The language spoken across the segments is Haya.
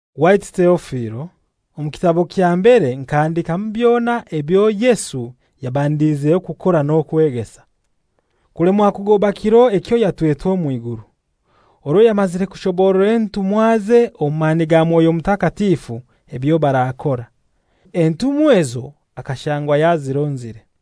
Waitu Teofilo, omu kitabo kya mbere nkahandikamu byona ebyo Yesu yabandiizeho kukora n'okwegesa, kulemwa kugoba kiro ekyo yatwetwe omw'iguru, orwo yamazire kushoborora entumwaze omu mani ga Mwoyo Mutakatifu ebyo barakora. Entumwa ezo akashangwa yazironzire.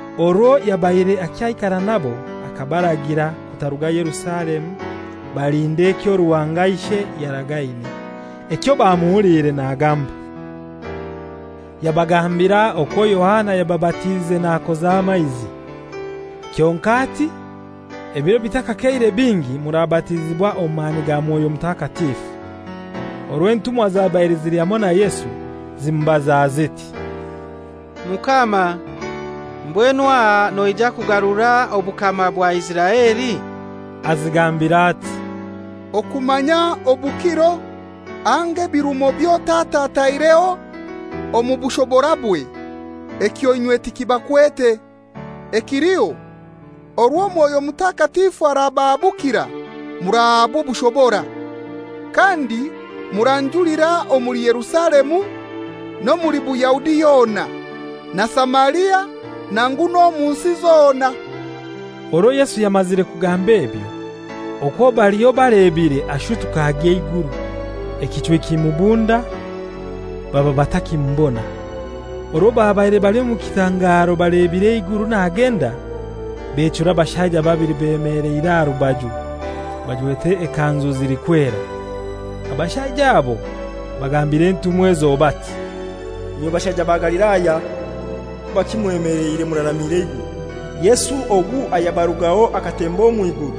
Orwo yabaire akyaikara nabo akabaragira kutaruga Yerusalemu, balinde ekyo Ruhanga Ishe yaragaine, ekyo bamuhuliire nagamba. Yabagambira okwo Yohana yababatiize nakoza amaizi, kyonkai ati ebiro bitakakeire bingi murabatizibwa omu mani ga Mwoyo Mutakatifu. Orwo entumwa zabaire zili hamoi na Yesu, zimubaza ziti, «Mukama, mbwenu aha noija kugarura obukama bwa Isiraeli?» Azigambira ati, «Okumanya obukiro anga ebirumo byo Tata ataireho omu bushoborabwe ekyo inywe tikibakwete. Ekiliho, orwo Mwoyo Mutakatifu arabahabukira murahaabwa obushobora. Kandi muranjulira omuli Yerusalemu n'omuli Buyahudi yona, na Samaria, nangu n'omu nsi zona.» Orwo Yesu yamazire kugamba ebyo, okwo baliho balebire ashutuka agya eiguru, ekichwi kimubunda, baba batakimubona. Orwo babaire bali omu kitangaro balebire eiguru nagenda, bechura abashaija babili bemeleire aha rubaju, bajwete ekanzu zilikwera. Abashaija abo bagambira entumwa ezo bati, «Inywe bashaija ba Galilaya, kubaki mwemeleire muraramire eiguru? Yesu ogu ayabarugaho akatemba omw'iguru,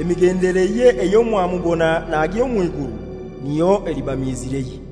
emigendereye eyo mwamubona nagya omw'iguru, niyo eliba miizireye.»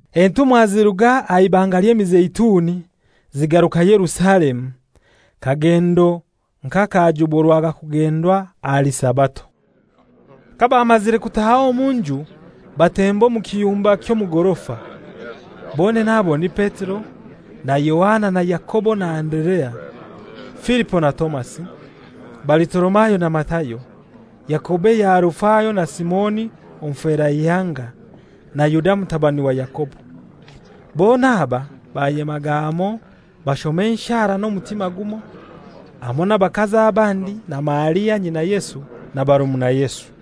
Entumwa ziruga aha Ibanga ly'Emizeituni zigaruka Yerusalemu, kagendo nk'akajuburwaga kugendwa ahali Sabato. Kabamazire kutaaha omu nju batemba omu kiyumba ky'omu gorofa. Bonene abo ni Petero na Yohana na Yakobo na Anderea, Filipo na Tomasi, Balitolomayo na Matayo, Yakobo eya Alufayo na Simoni Omuferaihanga, na Yuda mutabani wa Yakobo. Bona aba bayemaga hamoi bashoma enshara n'omutima gumoi, hamoi n'abakazi abandi na Maria nyina Yesu, na barumuna Yesu.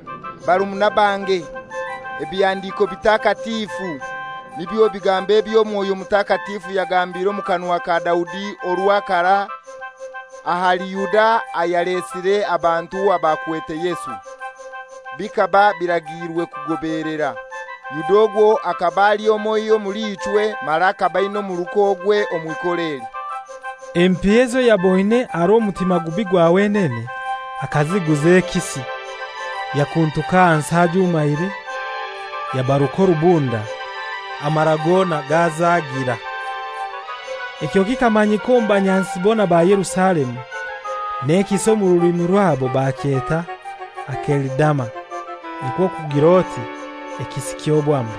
«Barumuna bange, Ebihandiko Bitakatifu, nibyo bigambo ebyo Mwoyo Mutakatifu yagambire omu kanwa ka Daudi orwa karai ahali Yuda ayalesire abantu abakwete Yesu, bikaba biragiirwe kugobeelera. Yuda ogwo akaba ali omoiho omuli ichwe, mara akaba aina omuruka ogwe omw'ikora eli. «(Empiya ezo yaboine aha rw'omutima gubi gwa wenene akaziguza ekisi; yakuntuka ahansi ajumaire, yabaruka orubunda, amara gona gazagira. Ekyo kikamanyika omu banyansi bona ba Yerusalemu, n'ekisi omu rulimi rwabo bakyeta ‹Akelidama,› nikwo kugir'oti, ‹Ekisi ky'Obwamba.›)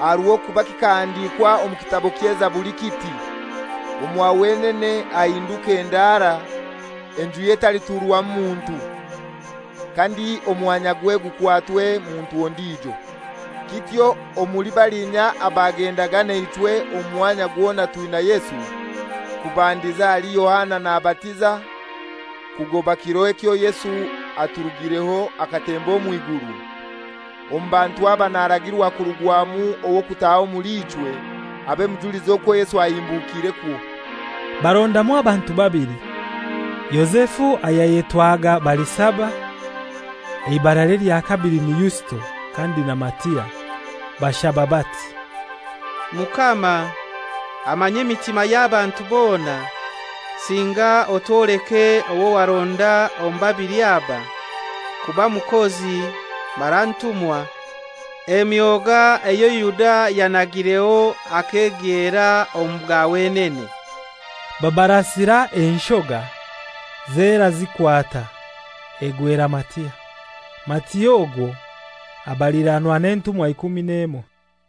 Aha rw'okuba kikahandikwa omu Kitabo ky'Ezaburi kiti, ‹Omwa wenene hahinduke ndaara, enjuye etaliturwamu muntu; kandi omwanyagwe gukwatwe muntu ondijo.› Kityo omuli balinya abagendaga naichwe omwanya gwona twina Yesu, kubandiza ahali Yohana nabatiza, kugoba kiro ekyo Yesu aturugireho akatemba omw'iguru, omu bantu aba naragirwa kurugwamu ow'okutaha omuli ichwe, abe mujulizi okwo Yesu ahimbukirekwo.» Barondamu abantu babili, Yozefu ayayetwaga Barisaba, eibaralye lya kabili ni Yusito, kandi na Matia. Bashaba bati, «Mukama amanya emitima y'abantu bona, singa otwoleke owo waronda omu babili aba kuba mukozi mara ntumwa, emyoga eyo Yuda yanagireho akegyera omu ga wenene.» Babarasira enshoga, zera zikwata, egwera Matia. Matia ogwo abaliranwa n'entumwa ikumi n'emoi.